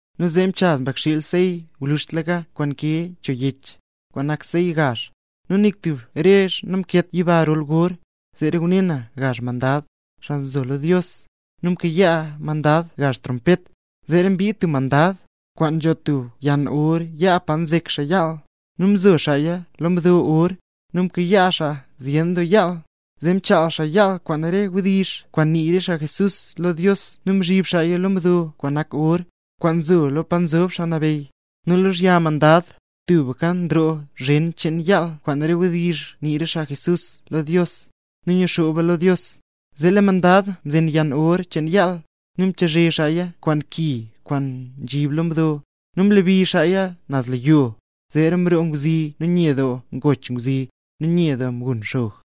Nu zee mchaz Mbakxiil sey gwluzhtlaka kwaan nkee cho yech, kwaan nak sey gaazha, nu nik tub rezh namkeet yiba rol gor. Zeera ngune na lo gazh mandad, xaa nzo lo Dios; nu mkayaa mandad gazh trompet. Zeera mbid stub mandad, kwaan nzho tub yann or yaa, pa nzek xaa yaal, nu mzo xaaya lo mdo or. Nu mkayaa xaa zyen doo yaal, zee mchaal xaa yaal kwaan re wdizh kwaan nii re xaa mle nambey Jesús lo Dios nu mzhib xaaya lo mdo kwaan nak or, kwaan nzo lo pa nzob Xaa Nabeyy. Nu lozhya mandad, tubka nroo zhen cheen yaal kwaan re wdizh kwaan nii re xaa Jesús lo Dios, nu nguxooba lo Dios. Zee lee mandad mzen yann or cheen yaal, nu mchazhe xaaya kwaan ki kwaan nzhib lo mdo, nu mlebi xaaya naz lo yizhyo. Zeera mroo ngwzi nu nye doo ngoch ngwzi, nu nye doo mgun xog.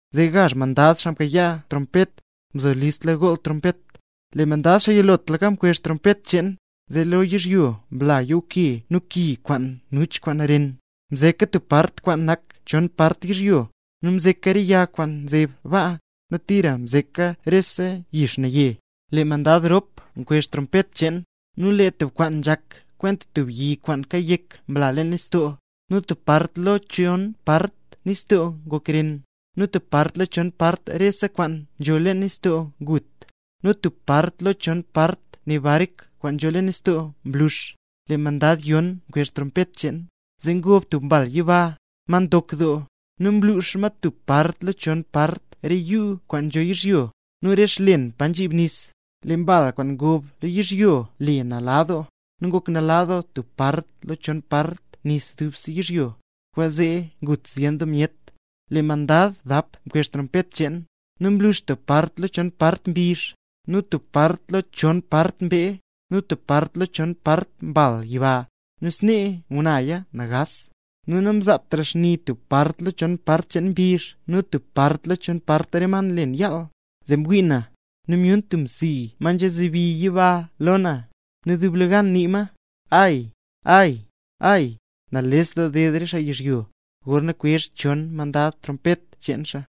Lee gazh mandad xaa mkayaa trompet, mzo listla gool trompet. Lee mandad, xaa yilotlaka mkwezh trompet cheen, zee lee lo yizhyo mla yuuke nu ki kwaan nuch kwaan ren. Mzeka tub part kwaan nak chon part yizhyo, nu mzeka re yag kwaan nzeb baa, nu tira mzeka rese yix naye. Lee mandad rop mkwezh trompet cheen, nu lee tub kwaan nzhak kwenta tub yi kwaan kayek mla leen nistoo, nu tub part lo chon part nistoo ngok ren; nu tub part lo chon part rese kwaan nzho leen nistoo ngut, nu tub part lo chon part re bark kwaan nzho leen nistoo mlux. Lee mandad yon mkwezh trompet cheen, zee ngob tub mbal yiba, ma ndok doo, nu mlux ma tub part lo chon part re yuu kwaan nzho yizhyo, nu re xlen pa nzhib nis. Lee mbal kwaan ngob lo yizhyo le Nala Doo; nu ngok nala doo tub part lo chon part nis dubse yizhyo, kwaanzee ngut zyen doo myet. Lee mandad dap mkwezh trompet cheen, nu mlux tub part lo chon part mbizh, nu tub part lo chon part mbee, nu tub part lo chon part mbal yiba, nu snee ngunaya nagaas. Nu namzaatra xni tub part lo chon part cheen mbizh nu tub part lo chon part re ma kwaan nlen yaal. Zee mwii na, nu myun tub msi, ma nzebi yiba lo na, nu dublegan nii ma: —¡Ay, ay, ay, nales doo ded re xaa yizhyo, gorna kwezh xchon mandad trompet xcheen xaa!